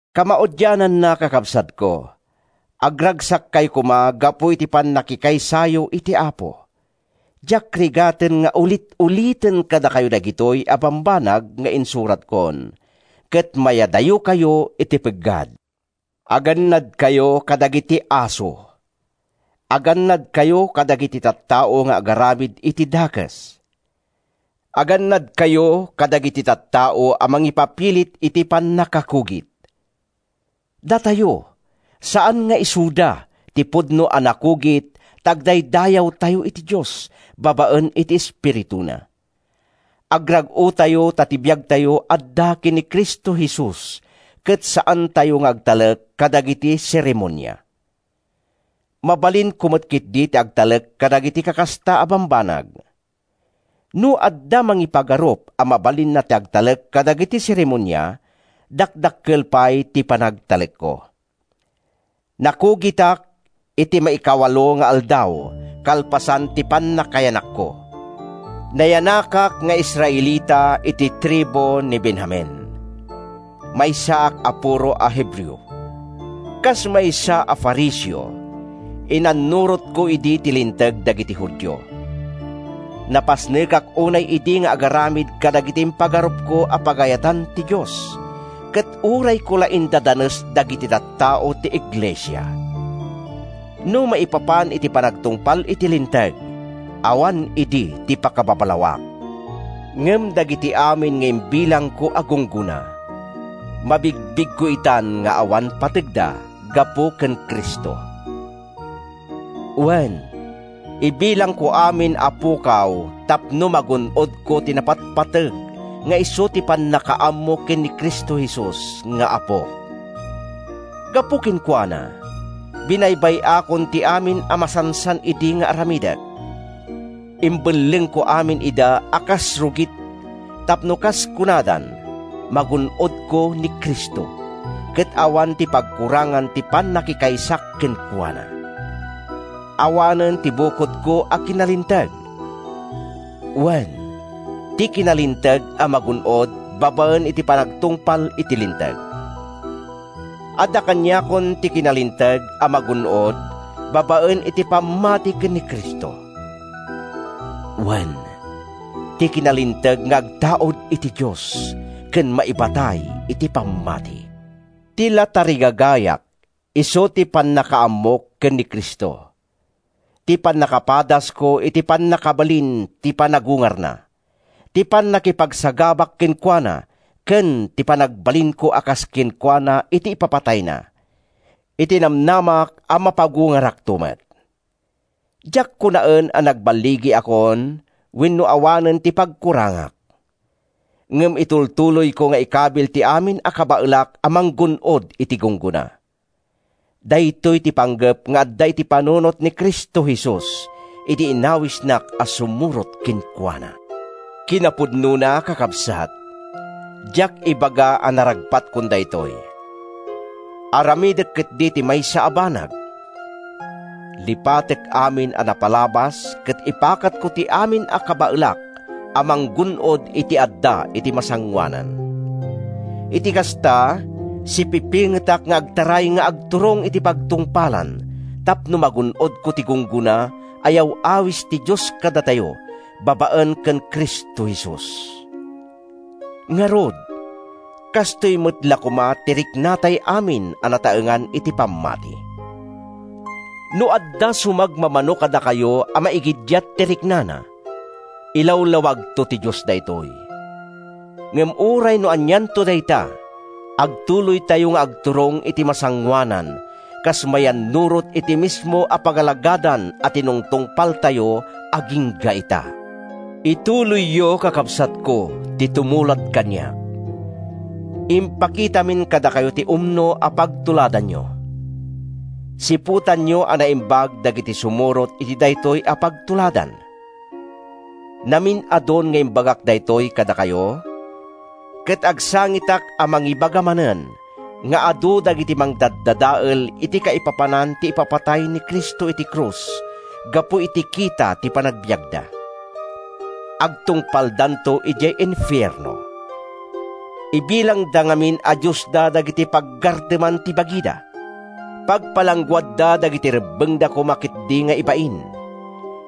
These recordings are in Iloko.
Kamaudiananna, kakabsatko, agragsakkayo koma gapu iti pannakikaysayo iti Apo. Diak rigaten nga ulit-uliten kadakayo dagitoy a bambanag nga insuratkon, ket mayadayokayo iti peggad. Agannadkayo kadagiti aso. Agannadkayo kadagiti tattao nga agaramid iti dakes. Agannadkayo kadagiti tattao a mangipapilit iti pannakakugit. Datayo, saan nga isuda, ti pudno a nakugit ta agdaydayawtayo iti Dios babaen iti Espirituna. Agrag-otayo ta ti biagtayo adda ken Cristo Jesus ket saantayo nga agtalek kadagiti seremonia. Mabalinko met ketdi ti agtalek kadagiti kakasta a bambanag. No adda mangipagarup a mabalinna ti agtalek kadagiti seremonia, dakdakkel pay ti panagtalekko. Nakugitak iti maikawalo nga aldaw kalpasan ti pannakayanakko. Nayanakak nga Israelita iti tribu ti Benjamin. Maysaak a puro a Hebreo. Kas maysa a Fariseo, inannurotko idi ti Linteg dagiti Judio. Napasnekak unay idi nga agaramid kadagiti impagarupko a pagayatan ti Dios, ket urayko la indadanes dagiti tattao ti iglesia. No maipapan iti panagtungpal iti Linteg, awan idi ti pakababalawak. Ngem dagiti amin nga imbilangko a gunggona, mabigbigko itan nga awan pategda, gapu ken Cristo. Wen, ibilangko amin a pukaw tapno magun-odko ti napatpateg nga isu ti pannakaammo ken ni Cristo Jesus nga Apok. Gapu kenkuana, binaybay-akon ti amin a masansan idi nga aramidek. Imbellengko aminen ida a kas rugit tapno, kas kunadan, magun-odko ni Cristo, ket awan ti pagkurangan ti pannakikaysak kenkuana. Awanen ti bukodko a kinalinteg, wen, ti kinalinteg a magun-od babaen iti panagtungpal iti Linteg. Adda kaniakon ti kinalinteg a magun-od babaen iti pammati ken ni Cristo; wen, ti kinalinteg nga agtaud iti Dios, ken maibatay iti pammati. Ti la tarigagayak isu ti pannakaammok ken ni Cristo, ti pannakapadasko iti pannakabalin ti panagungarna, ti pannakipagsagabak kenkuana ken ti panagbalinko a kas kenkuana iti ipapatayna, iti namnamak a mapagungarakto met. Diak kunaen a nagballigiakon wenno awanen ti pagkurangak. Ngem itultuloyko nga ikabil ti amin a kabaelak a manggun-od iti gunggona. Daytoy ti panggep nga adda iti panunot ni Cristo Jesus idi inawisnak a sumurot kenkuana. Kinapudnona, kakabsat, diak ibaga a naragpatkon daytoy. Aramidek ketdi ti maysa a banag: Lipatek amin a napalabas ket ipakatko ti amin a kabaelak a manggun-od iti adda iti masangoanan. Iti kasta, sipipingetak nga agtaray nga agturong iti pagtungpalan tapno magun-odko ti gunggona a yaw-awis ti Dios kadatayo babaen ken Cristo Jesus. Ngarud, kastoy met la koma ti riknatay amin a nataengan iti pammati. No adda sumagmamano kadakayo a maigiddiat ti riknana, ilawlawagto ti Dios daytoy. Ngem uray no anianto dayta, agtuloytayo nga agturong iti masangoanan kas mayannurot iti mismo a pagalagadan a tinungtungpaltayo agingga ita. Itultuloyyo, kakabsatko, ti tumulad kaniak. Impakitamin kadakayo ti umno a pagtuladanyo. Siputanyo a naimbag dagiti sumurot iti daytoy a pagtuladan. Namin-adun nga imbagak daytoy kadakayo, ket agsangitak a mangibaga manen nga adu dagiti mangdaddadael iti kaipapanan ti ipapatay ni Cristo iti krus gapu iti kita ti panagbiagda. Agtungpaldanto idiay infierno. Ibilangda ngamin a diosda dagiti paggarteman ti bagida. Pagpalangguadda dagiti rebbengda koma ketdi nga ibain,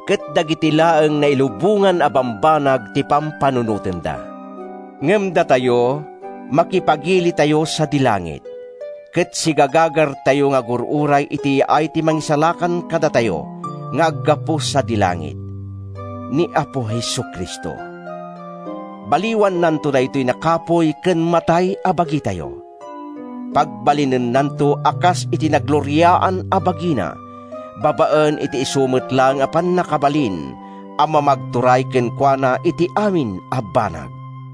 ket dagiti laeng nailubongan a bambanag ti pampanunotenda. Ngem datayo, makipagilitayo sadi langit, ket sigagagartayo nga agur-uray iti yaay ti Mangisalakan kadatayo nga aggapu sadi langit, ni Apo Jesu-Cristo. Baliwannanto daytoy nakapuy ken matay a bagitayo. Pagbalinennanto a kas iti nagloriaan a bagina babaen iti isu met laeng a pannakabalin a mamagturay kenkuana iti amin a banag.